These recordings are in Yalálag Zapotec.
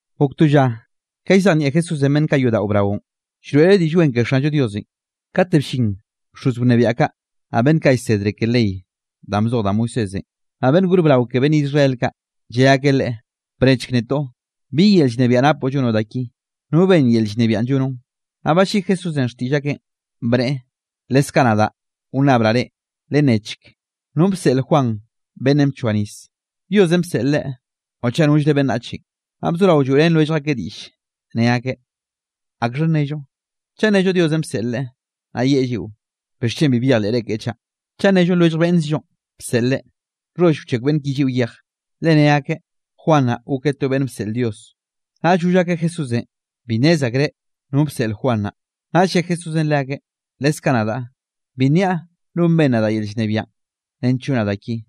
Gok to lla ka llzejnieꞌ Jesúsenꞌ beꞌnn kaꞌ yodaꞌo braonꞌ, llroeꞌreꞌ Diꞌll Wen ke Xanllo Diosenꞌ, kate bllin bxoz wnebiaꞌ kaꞌ, naꞌ beꞌnn kaꞌ llsedre ke ley danꞌ bzoj da Moisésenꞌ, naꞌ beꞌnn gor brao ke beꞌnn Israel kaꞌ, lle akeꞌ Leꞌe: —Bnechk netoꞌ, ¿bi yel llnebiaꞌ napoꞌ llonoꞌ da ki? ¿No benn yel llnebiaꞌn llonoꞌn? Naꞌll balliꞌi Jesúsenꞌ xtiꞌll akeꞌn, bneꞌe: —Leskaꞌ nadaꞌ wnnabraꞌ reꞌ, lennechk, ¿nonꞌ bseꞌl Juan beꞌnnenꞌ bchoa nis? ¿Diosenꞌ bseꞌl leꞌe o chaꞌ nollre beꞌnnachenꞌ? Naꞌ bzorao lloeꞌrén lwellj akeꞌ diꞌll, ne akeꞌ: —¿Akxha nnello? Chaꞌ nnello Diosenꞌ bseꞌl leꞌe, naꞌ yeꞌe lliꞌo: “¿Bixchen bi byejleꞌre keꞌe chaꞌ?” Chaꞌ nnello lwellj beꞌnnkzllonꞌ bseꞌl leꞌe, nxholl wchekw beꞌnn ki lliꞌo yej, le ne akeꞌ Juan naꞌn gokeꞌ to beꞌnn bseꞌl Dios. Naꞌll goll akeꞌ Jesúsenꞌ bi nnez akreꞌ no bseꞌl Juan naꞌ. Naꞌll lle Jesúsenꞌ leakeꞌ: —Leskaꞌ nadaꞌ, bi nniaꞌ non benn nadaꞌ yel llnebiaꞌn nench llonaꞌ da ki.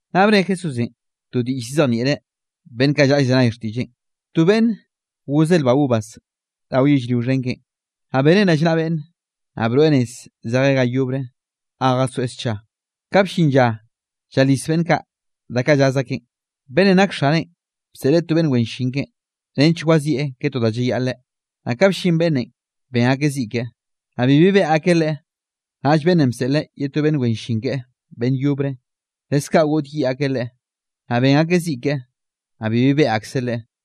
Naꞌ bne Jesúsenꞌ to diꞌll llzejnieꞌreꞌ beꞌnn kaꞌ llaꞌa llzenay xtiꞌlleꞌn: —To beꞌnne, gozeꞌ lba uvas rao yellrio xhen keꞌen, naꞌ beneꞌn rallnaꞌa beꞌnne, naꞌ broeꞌ nez zejeꞌ ga yobre ga jasoeꞌ scha. Ka bllin lla llalis beꞌnn kaꞌ da kaꞌ llaz akeꞌn, beꞌnnenꞌ nak xaneꞌn bseꞌleꞌ to beꞌnn wen llin keꞌen, nench wazieꞌ ke to da llayaꞌleꞌ. Naꞌ ka bllin beꞌnnenꞌ, ben akeꞌ ziꞌ keꞌe, naꞌ bibi beꞌe akeꞌ leꞌe. Naꞌll beꞌnnenꞌ bseꞌleꞌ ye to beꞌnn wen llin keꞌe beꞌnn yobre, leskaꞌ goꞌdyiꞌ akeꞌ leꞌe, naꞌ ben akeꞌ ziꞌ keꞌe, naꞌ bibi beꞌe akseꞌ leꞌe.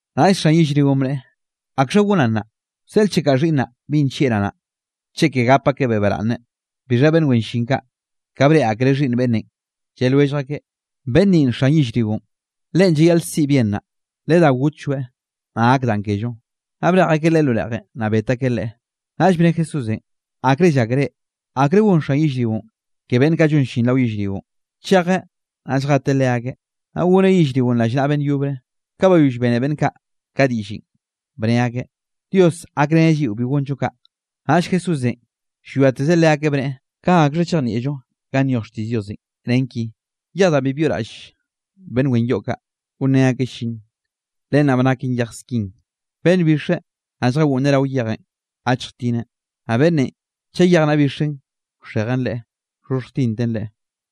’Naꞌll xan yellrionꞌ bneꞌe: “¿Akxha gonaꞌ nnaꞌ? Wseꞌlchekaꞌ xhiꞌnnaꞌ binꞌ nllieꞌraꞌ naꞌ, cheke gap akebeꞌ baraꞌnne.” Bixha beꞌnn wen llin kaꞌ, ka breꞌe akreꞌ xhiꞌnn beꞌnnenꞌ, lle lwellj akeꞌ: “Beꞌnn ninꞌ xhiꞌnn xan yellrionꞌ, leꞌen llayaꞌl siꞌi bien naꞌ, ledá gotlloeꞌ, naꞌ gak danꞌ kello.” Naꞌ brej akeꞌ leꞌe lo reꞌjenꞌ, naꞌ bet akeꞌ leꞌe. Naꞌll bne Jesúsenꞌ: —¿Akre llákere, akre gon xan yellrionꞌ ke beꞌnn kaꞌ llon llin rao yellrionꞌ? Chejeꞌ, naꞌ lljeteꞌ leakeꞌ, naꞌ goneꞌ yellrionꞌ rallnaꞌa beꞌnn yobre. Ka bayoll bene beꞌnn kaꞌ ka diꞌllenꞌ, bne akeꞌ: —¡Dios gakreneꞌ lliꞌo bi gonllo kaꞌ! Naꞌll Jesúsenꞌ llwiatezeꞌ leakeꞌ, bneꞌe: —¿Ka akxha chejnieꞌllo ganꞌ nyoj xtiꞌll Diosenꞌ, nen ki?: Yej danꞌ bi byoꞌraꞌll beꞌnn wen yoꞌ kaꞌ, gonrén akeꞌ llin, len naꞌ ba naken yej skin. Beꞌnn bixe, naꞌ lljagoꞌnneꞌ rao yejenꞌ, gachjtineꞌ, naꞌ beꞌnnenꞌ chaꞌ yej naꞌ bixen wxejen leꞌe, wxhoxhjtinten leꞌe.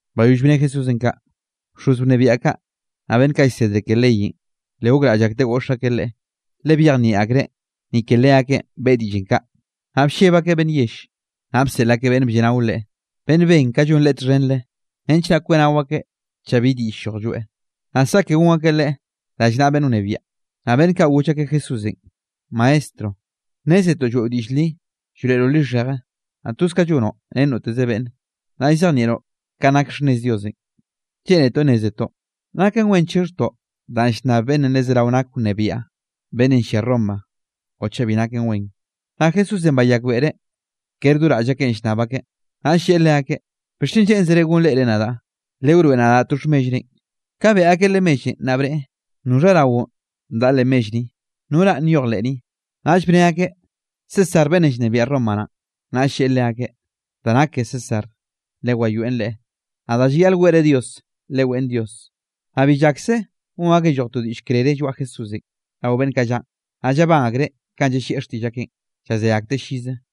Bayoll bne Jesúsenꞌ kaꞌ, bxoz wnebiaꞌ kaꞌ, naꞌ beꞌnn kaꞌ llsedre ke leyenꞌ, le gokraꞌll akteꞌ goꞌx akeꞌ Leꞌe, le byejnieꞌ akreꞌ ni ke leakeꞌn beꞌe diꞌllenꞌ kaꞌ, naꞌ blleb akeꞌ beꞌnn yell. Naꞌ bseꞌl akeꞌ beꞌnn blleꞌnao Leꞌe, beꞌnn ben ka llon Leꞌe txhenre, nench naꞌ kweꞌnao akeꞌ chaꞌ bi diꞌll lloj lloeꞌ, naꞌ saꞌke gon akeꞌ Leꞌe rallnaꞌa beꞌnn wnebiaꞌn. Naꞌ beꞌnn kaꞌ goll akeꞌ Jesúsenꞌ: —Maestro, nnézetoꞌ lloeꞌo diꞌll li llroeꞌroꞌ lixheje, naꞌ toz ka llonoꞌ ren noteze beꞌnne, naꞌ llzejnieꞌroꞌ kanꞌ nak xhnnez Diosenꞌ. Lleꞌnetoꞌ nnézetoꞌ, ¿naken wen chixhjtoꞌ danꞌ llnnab beꞌnnenꞌ le zeraoze nak wnebiaꞌ, beꞌnnenꞌ llia Roma o chaꞌ bi naken wen? Naꞌ Jesúsenꞌ bayakbeꞌreꞌ kere do raꞌll akeꞌn llnnab akeꞌ, naꞌll lleꞌe leakeꞌ: —¿Bixchen lleꞌnzere gonreꞌre nadaꞌ? Lewroeꞌ nadaꞌ to xhmellrenꞌ. Ka beꞌe akeꞌ Leꞌe mellenꞌ, naꞌ bneꞌe: —¿Noxha raonꞌ daꞌa leꞌ mell ni? ¿No ranꞌ nyoj le ni? Naꞌll bne akeꞌ: —César beꞌnnenꞌ llnebiaꞌ Roma naꞌn. Naꞌll lleꞌe leakeꞌ: —Da nake ke César lewayoeꞌn leꞌe; naꞌ da llayaꞌl weꞌre Dios, leweꞌn Dios. Naꞌ bi llakse gon akeꞌ lloj to diꞌll krere lloaꞌ Jesúsenꞌ rao beꞌnn kaꞌ llaꞌn, naꞌ llabán akreꞌ kanꞌ llallieꞌ xtiꞌll akeꞌn, llazé akteꞌ llize.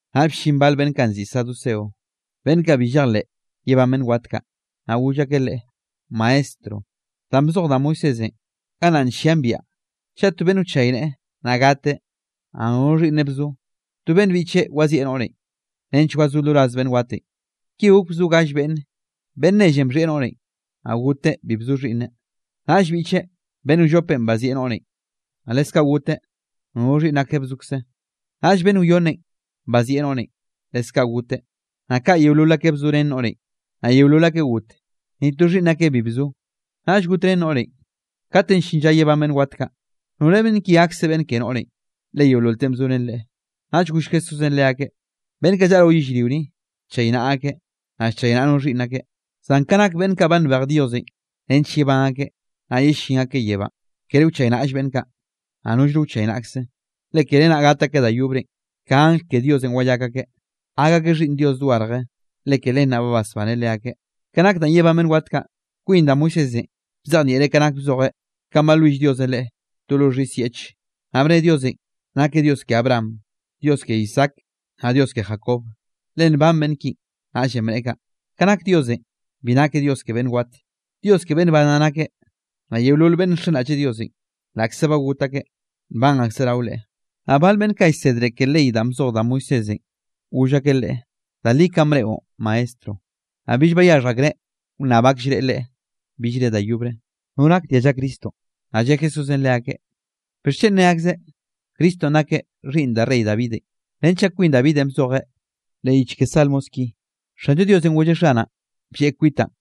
Naꞌll bllin bal beꞌnn kaꞌ nziꞌi saduceo, beꞌnn kaꞌ bi llejleꞌ yebán beꞌnn wat kaꞌ. Naꞌ goll akeꞌ Leꞌe: —Maestro, danꞌ bzoj da Moisésenꞌ, gannaꞌ nllian biaꞌa, chaꞌ to beꞌnn wchayneꞌe, naꞌ gateꞌ, naꞌ nono xhiꞌnneꞌ bzo, to beꞌnn biꞌcheꞌ wazieꞌ noꞌrenꞌ nench wazó lo raz beꞌnn watenꞌ. Ki gok bzo gall beꞌnne, beꞌnn nellenꞌ bxhieꞌ noꞌrenꞌ, naꞌ goteꞌ bi bzo xhiꞌnneꞌ. Naꞌll biꞌcheꞌ, beꞌnn wllopenꞌ bazieꞌ noꞌrenꞌ, naꞌ leskaꞌ goteꞌ nono xhiꞌnn akeꞌ bzokze. Naꞌll beꞌnn wyonne bazieꞌ noꞌrenꞌ, leskaꞌ goteꞌ, naꞌ kaꞌ yeolol akeꞌ bzorén noꞌrenꞌ, naꞌ yeolol akeꞌ got, ni to xhiꞌnn akeꞌ bi bzo. Naꞌll got ren noꞌrenꞌ. Kate llin lla yebán beꞌnn wat kaꞌ, ¿nore beꞌnn ki gakse beꞌnn ke noꞌrenꞌ, le yeololeꞌn bzorén leꞌe? Naꞌ goll Jesúsenꞌ leakeꞌ: —Beꞌnn kaꞌ llaꞌa rao yellrio ni, llchaynaꞌa akeꞌ, naꞌ llchaynaꞌa no xhiꞌnn akeꞌ. Zan ka nak beꞌnn kaꞌ ba nbej Diosenꞌ nench yebán akeꞌ, naꞌ yellín akeꞌ yebánꞌ, kere wchaynaꞌll beꞌnn kaꞌ, naꞌ nollno wchaynaꞌkze. Le kere naꞌ gat akeꞌ da yobrenꞌ, ka angl ke Diosenꞌ wayak akeꞌ, gak akeꞌ xhiꞌnn Dios dogarje, le ke len naꞌ ba basbaneꞌ leakeꞌ. Ka nak danꞌ de yebán beꞌnn wat kaꞌ, kwin da Moisésenꞌ bzejnieꞌreꞌn ka nak bzojeꞌ kanꞌ balwill Diosenꞌ leꞌe to lo xhis yeꞌche, naꞌ bne Diosenꞌ nakeꞌ Dios ke Abraham, Dios ke Isaac naꞌ Dios ke Jacob, le nban beꞌnn kinꞌ, naꞌllenꞌ bneꞌe kaꞌ. Ka nak Diosenꞌ, bi nakeꞌ Dios ke beꞌnn wat, Dios ke beꞌnn ban naꞌ nakeꞌ, naꞌ yeolol beꞌnn nxenraꞌlleꞌ Diosenꞌ, laꞌkze ba got akeꞌ, nban akseꞌ rao Leꞌe. Naꞌ bal beꞌnn kaꞌ llsedre ke ley danꞌ bzoj da Moisésenꞌ, goll akeꞌ Leꞌe: —Da li kanꞌ bneꞌon, Maestro. Naꞌ bill bayaxhj akreꞌ wnnab akllreꞌ Leꞌe billre da yobre. Naꞌ lle Jesúsenꞌ leakeꞌ: —¿Bixchen ne akzeꞌ, Cristonꞌ nakeꞌ xhiꞌnn da rey Davidenꞌ? Renchaꞌ kwin Davidenꞌ bzojeꞌ leꞌ yich ke Salmos ki: Xanllo Diosenꞌ golleꞌ Xanaꞌn: “Blleꞌ kwitaꞌn,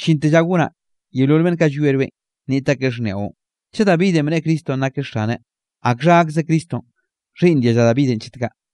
llinte lla ka gonaꞌ yeolol beꞌnn kaꞌ llwie rweꞌn, nniꞌt akeꞌ xhniaꞌon.” Chaꞌ Davidenꞌ bneꞌe Cristonꞌ nakeꞌ Xaneꞌ, ¿akxha gakze Cristonꞌ xhiꞌnn dialla ke Davidenꞌ chet kaꞌ?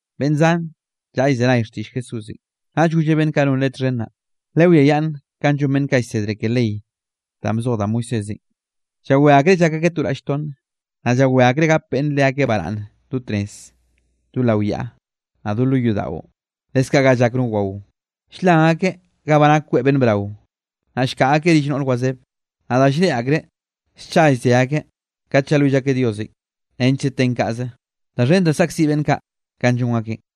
Beꞌnn zan llaꞌa llzenay xtiꞌll Jesúsenꞌ, naꞌll golleꞌ beꞌnn kaꞌ non Leꞌe txhen naꞌ: —Lewiayaꞌnn kanꞌ llon beꞌnn kaꞌ llsedre ke ley danꞌ bzoj da Moisésenꞌ, llawé akreꞌ llak akeꞌ to raꞌll tonn, naꞌ llawé akreꞌ gap beꞌnn leakeꞌ baraꞌnne do tnez, do lao yaꞌa, naꞌ do lo yodaꞌo. Leskaꞌ ga llak no wao, ll-lan akeꞌ ga ba nak kweꞌ beꞌnn brao. Naꞌ llkaꞌa akeꞌ rill noꞌr wazebe, naꞌ da lldeꞌ akreꞌ, scha llze akeꞌ kate llalwill akeꞌ Diosenꞌ nechkze ten kaꞌze. Da xhen da de saꞌkziꞌ beꞌnn kaꞌ kanꞌ llon akeꞌn.